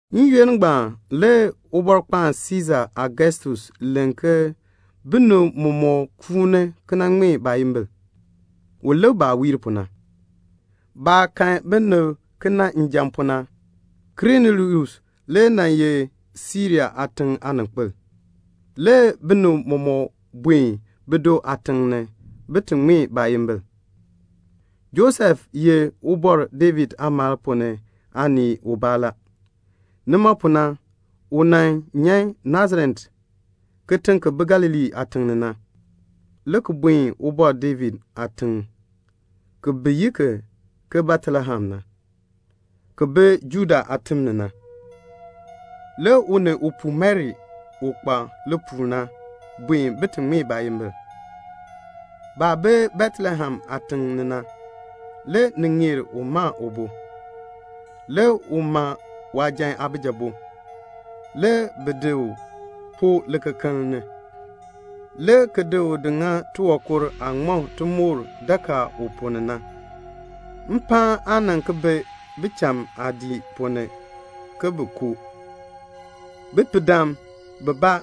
N-yoonn ngbaan le Ubɔrkpaan Siisa Augustus len ke binib mɔmɔk kuuni ki nan ŋmee baayimbil, un lik baah wiir pu na. Baah kahn binib kena njan pu na, le Kirinius ye Siria aatiŋ aaninkpil. Le binib mɔmɔk buen bido aatiŋ ni, bin ti ŋmee baayimbil. Josef ye Ubɔr David aamaal ponn ni aanii ubaa la. Nima pu na le u nyan Nasaret, kitiŋ ki bi Galilee aatiŋ ni na, le ki buen Ubɔr David aatiŋ, bi yi ki ke Betlehem, ki bi Judea aatiŋ ni na. Le u ni upuu Mari, u kpa lipuul na, buen bin ti ŋmee baayimbil. Baah bi Betlehem aatiŋ ni na, le ni ŋeer un ma ubo. Le u ma waajan aabijabo, le ki di u poo likekeln ni, le ki di u di ŋa tiwankur aah ŋmɔ timoor dakaa u ponn ni na; mpaan aa bi tichaandir ngbaan ponn ni, baah ga koo ni na. Le bipihdam bibaa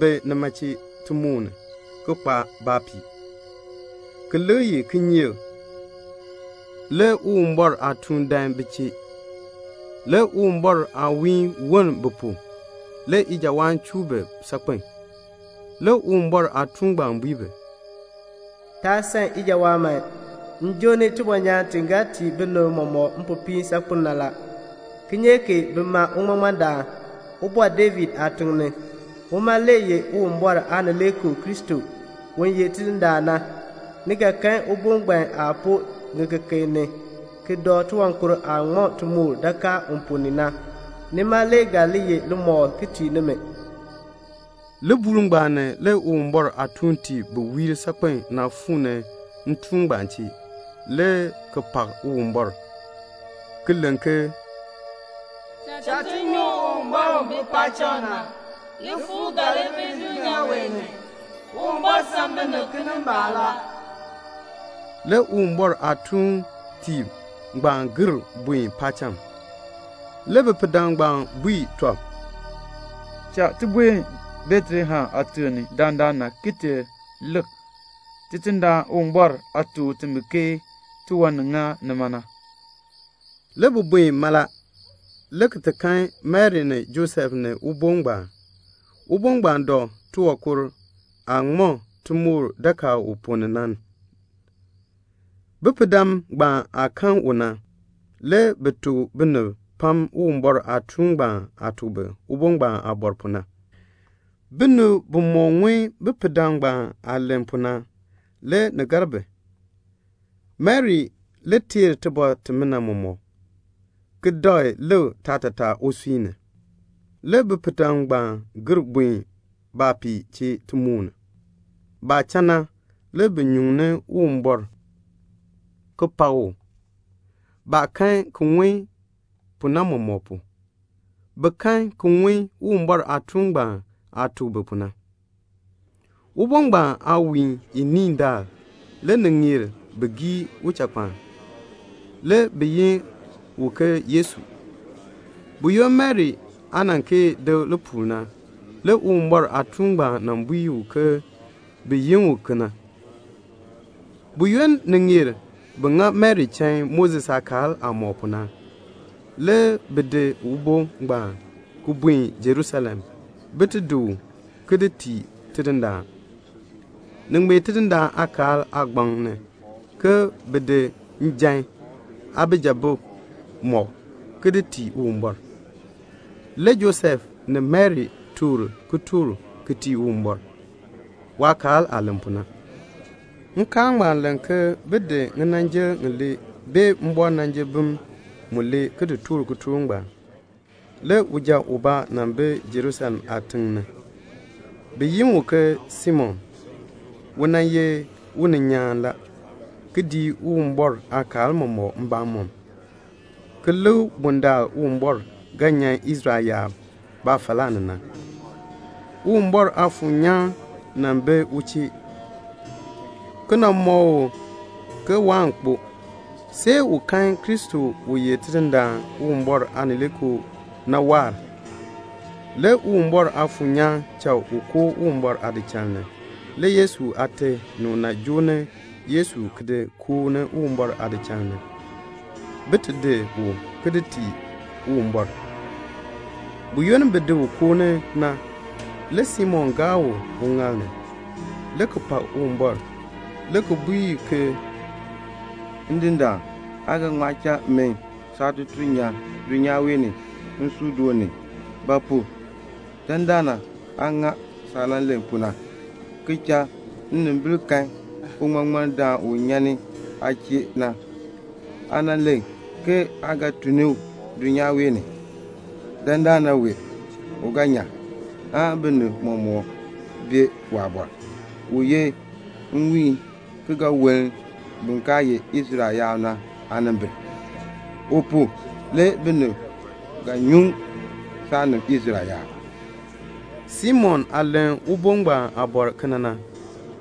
bi nima chee timoor ni, ki kpaa baapiih, ki lik i kinyeek. Le Tidindaan Uwumbɔr aatuun fuu ni bi chee. Le Tidindaan aawiihn woln bi pu. Le ijawaan chuu bi saakpen a. Le Uwumbɔr aatuun ngbaan bui bi, "Taa san ijawaan man. M joo ni tibɔnyaan ti ga tii binib mɔmɔk mpopiin saakpen na. Kinyeek kee bi ma Uŋmaŋmardaan, Ubɔr David aatiŋ ni. Uma le ye Uwumbɔr Aanileekoo Kristo u ye Tidindaan na. Ni ga kan ubo ngbaan aah poo ŋikeken ni na, ki dɔ tiwankur aah ŋmɔ timoor dakaa u ponn ni na. Nima le ga li ye limɔkl ki tii nimi." Libuul ngbaan ni le Uwumbɔr aatuuntiib bi wiir saakpen na fuu ni utuun ngbaan chee, le ki pak Uwumbɔr, ki len ke "Cha ti nyuŋ Uwumbɔr u bi paacham na. Lifuur ga li bi dulnyaa wee ni. Uwumbɔr san binib kinimbaak la." Le Uwumbɔr aatuuntiib ngbaan gir buen paacham. Le bipihdam ngbaan bui tɔb, "Cha ti buen Betlehem dandana, ki ti lik Tidindaan Uwumbɔr aah tuk timi ke tiwan ni ŋa nima na." Le bi buen mala, le ki ti kan Mari ni Josef ni ubo ngbaan. Ubo ngbaan dɔ tiwankur aah ŋmɔ timoor dakaa u ponn ni na. Bipihdam aah kan u na, le bi tuk binib pam Uwumbɔr aatuun ngbaan aah tuk bi ubo ngbaan aabɔr pu na. Binib bimɔk ŋun bipihdam aah len pu na, le ni gar bi. Mari le teer tibɔr timina mɔmɔk, ki dakl lik taatataa usui ni. Le bipihdam ngbaan gir buen baapiih chee timoor ni. Baah cha na, le bi nyuŋni Uwumbɔr ki pak u, baah kan ki ŋun pu na mɔmɔk pu; bi kan ki ŋun Uwumbɔr aatuun ngbaan aah tuk bi pu na. Ubo ngbaan aawiin iniin daal le ni ŋeer bin gii uchakpaln. Le bi yi u ke Yesu. Buyoonn Mari aa nan kee dek lipuul na, Uwumbɔr aatuun ngbaan bui u ke bin yi u kena. Buyoonn ni ŋeer bin ŋa Mari chain, Moses aakaal aah mɔk pu na, le bi di ubo ngbaan ki buen Jerusalem, bin ti di u ki di tii Tidindaan Uwumbɔr. Ni ŋmee Tidindaan Uwumbɔr aakaal aagbaŋ ni ke bin di njan aabim, mbijabim mɔmɔk ki di tii Uwumbɔr. Le Josef ni Mari toor kitork ki tii Uwumbɔr, waakaal aah len pu na. Nkaal ngbaan len ke bin di ŋinanjil ŋilee, bee mbɔrnanjibim mulee ki di toor kitork ngbaan. Le uja ubaa bi Jerusalem aatiŋ ni. Bi yi u ke Simeon. U ye uninyaan la, ki dii Uwumbɔr aakaal mɔmɔk mbamɔm, ki lik bundaln Uwumbɔr ga nyan Israel yaab baafalaa ni na. Uwumbɔr Aafuur nyaan bi u chee, ki nan mɔk u ke waan kpo, see u kan Kristo u ye Tidindaan Uwumbɔr Aanileekoo na. Le Uwumbɔr Aafuur nyaan cha u koo Uwumbɔr aadichal ni, le Yesu aate ni una joo ni Yesu ki koo ni Uwumbɔr aadichal ni, bin ti di u ki di tii Uwumbɔr. Buyoonn bi di u koo ni na le Simeon gaa u uŋaal ni, le ki pak Uwumbɔr, le ki bui ke "Ndindaan, aa ga ŋma cha m nyan dulnyaa wee ni, le m kpa nsuudoon; ba pu? Dandana aa ŋa saah nan len pu na la, ki cha nnimbil kan Uŋmaŋmardaan u nyan aa chee na. Aa nan len ke aa ga tun ni u dulnyaa wee ni. Dandana wee u ga nyan, aan binib mɔmɔk bee waabɔr. U ye nwiihn ki ga woln bin kaa ye Israel yaab na aanimbil. U pu, le binib ga nyuŋ saanib Israel yaab." Simeon aah len ubo ngbaan aabɔr kena na,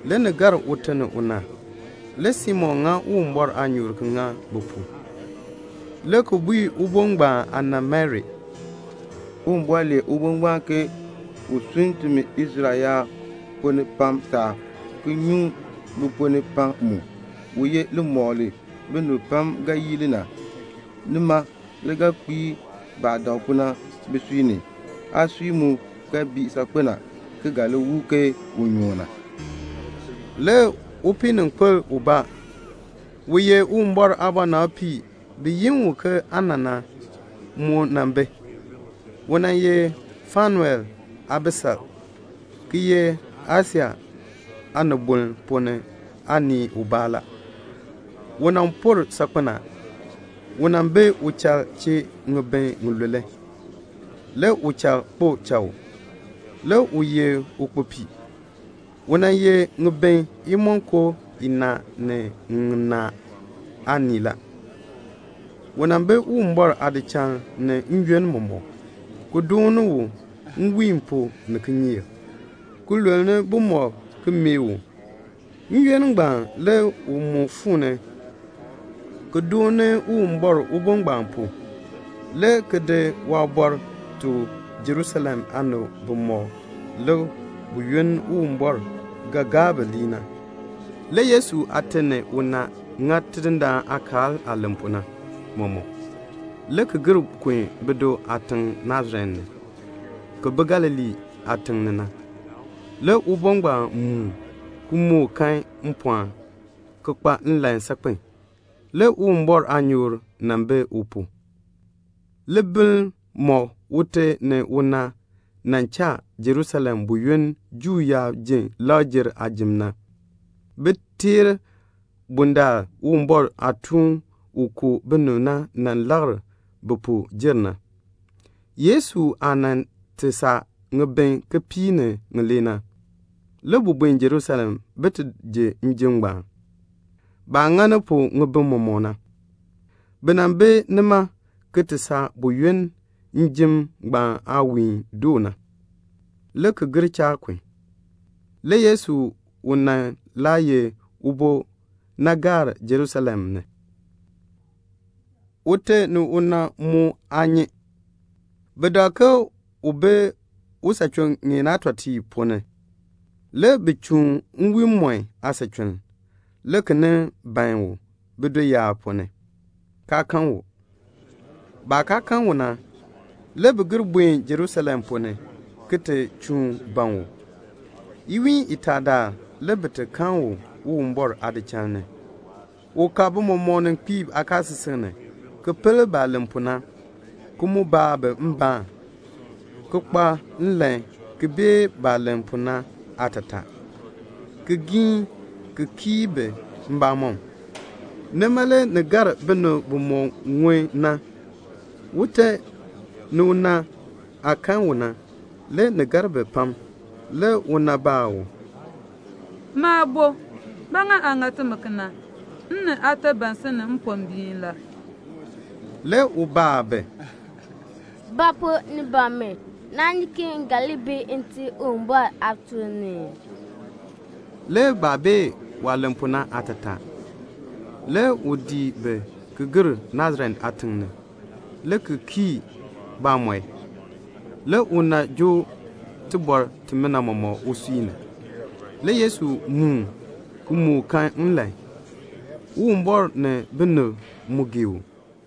le ni gar ute ni una. Le Simeon ŋa Uwumbɔr aanyoor ki ŋa bi pu, le ki bui ubo ngbaan aana Mari, "Uwumbɔr lee ubo ngbaan ke un sunn timi Israel yaab ponn ni pam taab, ki nyuŋ bi ponn ni pam. U ye limɔkl li binib pam ga yii li na. Nima le ga kpiir baah dak pu na bisui ni. Aasui mu ga bii saakpen a, ki ga li wu ke unyoohn na." Le upininkpil ubaa, u ye Uwumbɔr aabɔnabpii na, bi yi u ke Ana, mu nan bi. U ye Fanuel aabisal, ki ye Asher aanibol ponn ni aanii ubaa la. U por saakpen a. U nan bi uchal chee ŋibin ŋilule, uchal kpo cha u, le u ye ukpopii. U ye ŋibin imonko inaa ni ŋinaa. U bi Uwumbɔr aadichal ni n-yoonn mɔmɔk, ki dooni u nwiin pu ni kinyeek, ki lul bumɔb, ki mee u. N-yoonn ngbaan le u mu fuu ni, ki dooni Uwumbɔr ubo ngbaan pu, le ki di waabɔr ki tuk Jerusalem aanib bimɔk lik buyoonn Uwumbɔr ga gaa bi lii na. Le Yesu aate ni una ŋa Tidindaan Uwumbɔr aakaal aah len pu na mɔmɔk, le ki gir kun bido aatiŋ Nasaret ni, ki bi Galilee aatiŋ ni na. Le ubo ngbaan muun, ki moo kan mpɔɔn, ki gbiin nlan saakpen a. Le Uwumbɔr aanyoor nan bi u pu. Libiln mɔmɔk le ute ni una cha Jerusalem buyoonn Juu yaab ji Lakr-jer aajim, bin ti teer bundaln Uwumbɔr aatuun u ku binib na nan jer cha bi na. Yesu aah nan ti saa ŋibin kipiik ni ŋilee na, le bi buen Jerusalem bin ti ji njim ngbaan, baah ŋani pu ŋibin mɔmɔk na. Bi bi nima ki ti saa buyoonn njim ngbaan aawiin doo na, le ki gir cha kun. Le ubijabo Yesu gur ki bi Jerusalem. Ute ni una mu aa nyi. Bi dak ke u bi usachuln ŋeen aatɔtiib ponn ni. Le bi chuun nwiimɔn aasachuln, le ki nin ban u bidoyaab ponn ni, kaa kan u. Baah kaa kan u na, le bi gir buen Jerusalem ponn ni, ki chuun ban u. Iwiin itaa daal le bi kan u Uwumbɔr aadichal ni. U ka bimɔmɔkninkpiib aakaasisik ni, ki pel baah len pu na, ki mu baa bi mbaan, ki kpa nlan ki bee baah len pu na aatataa, ki giin ki kii bi mbamɔm. Nima le ni gar binib bimɔk ŋun na. Ute ni una aah kan u na, le ni gar bi pam. Le una baa u, "Maabo, ba ŋa aa ŋa timi kena? M ni aate ban si ni mpombiin." Le u baa bi, "Ba pu ni ban mi? Naa nyi ke see m li bi Nte Uwumbɔr aatuln ni ii?" Le baa bee waah len pu na aatataa. Le u dii bi ki fuu ni Nasaret aatiŋ ni, le ki kii baamɔi. Le una joo tibɔr timina mɔmɔk usui ni. Le Yesu muun ki moo kan nlan. Uwumbɔr ni binib mu gee u la.